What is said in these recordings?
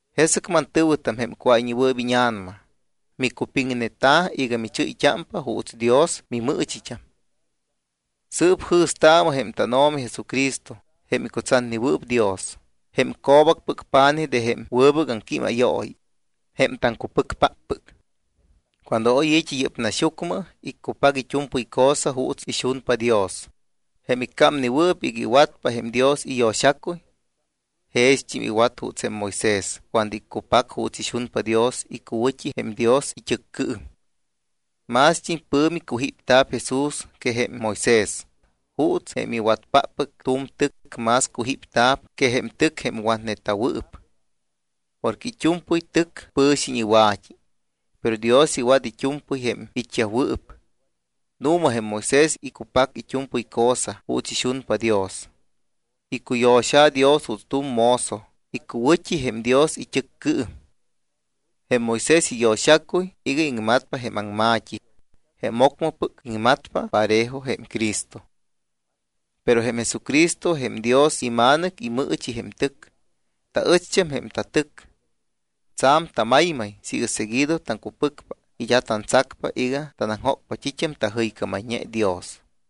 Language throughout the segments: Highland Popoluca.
Jesɨc mantɨ̱wɨtam, jém cuáyñewɨɨp íña̱nama, micupiŋneta iga michɨ́yt́ámpa juuts Dios mimɨɨchit́am. Sɨɨp jɨ̱staamɨ jém tánO̱mi Jesucristo, jém icutsatnewɨɨp Dios, jém co̱bacpɨc pa̱nij de jém wɨbɨc aŋquímayooyi, jém taŋcupɨcpáppɨc. Cuando oy i̱t́i yɨ́p naxyucmɨ iccupac it́u̱mpɨy cosa juuts ixunpa Dios, jém iccámnewɨɨp iga iwatpa jém Dios iyo̱xacuy. Jext́im iwat juuts jém Moisés cuando iccupac juuts ixunpa Dios icuwɨ̱t́i jém Dios it́ɨccɨɨm. Mást́im pɨ̱mi cujípta̱p Jesús que jém Moisés, juuts jém iwatpáppɨc tu̱m tɨc más cujípta̱p que jém tɨc jém watneta̱wɨɨp. Porque it́u̱mpɨy tɨcyaj pɨ̱xiñ iwa̱t́i, pero Dios iwat it́u̱mpɨy jém it́yajwɨɨp. Nu̱ma jém Moisés iccupac it́u̱mpɨy cosa juuts ixunpa Dios. Icuyo̱xa̱ Dios juuts tu̱m mozo icuwɨ̱t́i jém Dios it́ɨccɨɨm. Jém Moisés iyo̱xacuy iga iŋmatpa jém aŋma̱t́i jém ocmɨpɨc iŋmatpa parejo jém Cristo. Pero jém Jesucristo, jém Dios iMa̱nɨc, imɨɨchi jém tɨc. Taɨcht́am jém tatɨc. Tsa̱m tamaymay siiga seguido taŋcupɨcpa y d́a tantsacpa iga tanaŋjócpa t́it́am tajɨycámayñe Dios.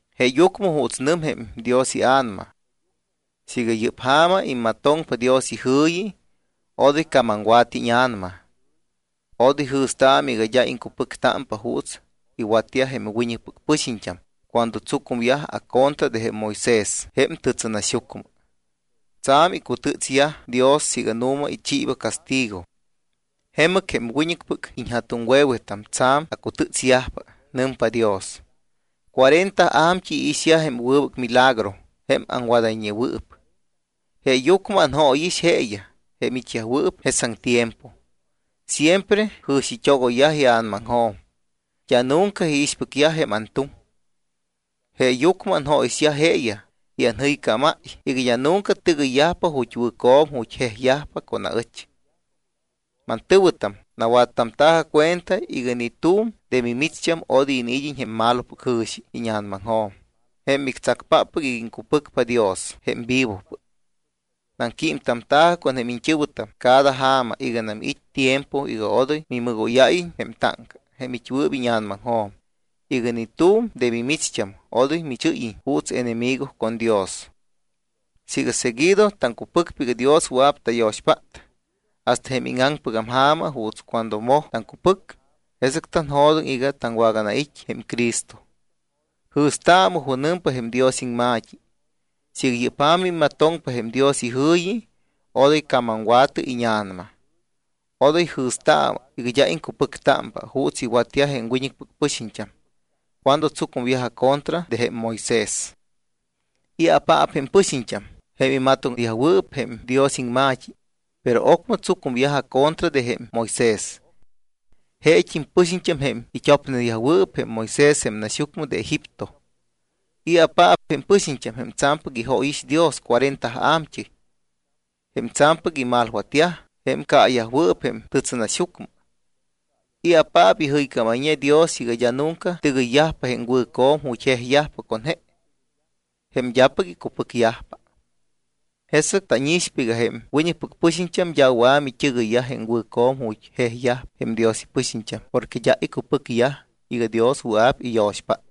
Jeeyucmɨ juuts nɨmpa jém Dios iA̱nama: Siiga yɨ́p ja̱ma immatoŋpa Dios ijɨ̱yi, Odoy camamwa̱tɨ íña̱nama. Odoy jɨ̱staamɨ iga d́a iŋcupɨctámpa juuts iwatyaj jém wiñɨcpɨc pɨxiñt́am cuando tsucumyaj acontra de jém Moisés jém tɨtsɨnaxyucmɨ. Tsa̱m icutɨtsyaj Dios siiga nu̱ma ichiiba castigo. Jemɨc jém wiñɨcpɨc iñja̱tuŋwe̱wetam tsa̱m acutɨ́tsyajpa, nɨmpa Dios. Cuarenta a̱mt́ɨy iixyaj jém wɨbɨc milagro jém aŋwadayñewɨɨp. Jeeyucmɨ anjóyix jeeyaj, jém it́yajwɨɨp jesaŋ tiempo. Siempre jɨ̱xit́ogoyyaj ia̱namaŋjo̱m, d́a nunca iixpɨcyaj jém antuŋ. Jeeyucmɨ anjóyixyaj jeeyaj y anjɨycámáy iga d́a nunca tɨgɨyyajpa ju̱t́ wɨ̱co̱m ju̱t́ jejyajpa con aɨch. Mantɨ̱wɨtam, nawattamta̱jɨ cuenta iga ni tu̱m de mimicht́am odoy iniid́iñ jém malopɨc jɨ̱xi íña̱namaŋjo̱m jém mictsacpáppɨc iga iŋcupɨcpa Dios jém vivopɨc. Naŋquímtamta̱jɨ con jém iñt́ɨ̱wɨtam cada ja̱ma iganam it́ tiempo iga odoy mimɨgóyáyiñ jém táŋca jém it́wɨɨp íña̱namaŋjo̱m iga ni tu̱m de mimicht́am odoy michɨ́yiñ juuts enemigo con Dios. Siiga seguido taŋcupɨcpa iga Dios wɨa̱p tayo̱xpát hasta jém íŋaŋpɨgam ja̱ma juuts cuando moj taŋcupɨc, jesɨc tanjo̱doŋ iga taŋwaganait́ jém Cristo. Jɨ̱staamɨ junɨmpa jém Dios iŋma̱t́i: Siiga yɨ́p ja̱ma immatoŋpa jém Dios ijɨ̱yi, odoy camamwa̱tɨ íña̱nama. Odoy jɨ̱staamɨ iga d́a iŋcupɨctámpa, juuts iwatyaj jém wiñɨcpɨc pɨxiñt́am cuando tsucumyaj acontra de jém Moisés. ¿I̱apaap jém pɨxiñt́am jém imatoŋneyajwɨɨp jém Dios iŋma̱t́i, pero ocmɨ tsucumyaj acontra de jém Moisés? Jeet́im pɨxiñt́am jém it́opneyajwɨɨp jém Moisés jém naxyucmɨ de Egipto. ¿I̱apaap jém pɨxiñt́am jém tsa̱mpɨc ijóyix Dios cuarenta a̱mt́ɨy? Jém tsa̱mpɨc imalwatyaj, jém caayajwɨɨp jém tɨtsɨnaxyucmɨ. ¿I̱apaap ijɨycámayñe Dios iga d́a nunca tɨgɨyyajpa jém wɨ̱co̱m ju̱t́ jejyajpa con je? Jém d́apɨc icupɨcyajpa. Jesɨc tánixpa iga jém wiñɨcpɨc pɨxiñt́am d́a wɨa̱ mit́ɨgɨyyaj jém wɨ̱co̱m ju̱t́ jejyajpa jém Dios ipɨxiñt́am porque d́a icupɨcyaj iga Dios wɨa̱p iyo̱xpát.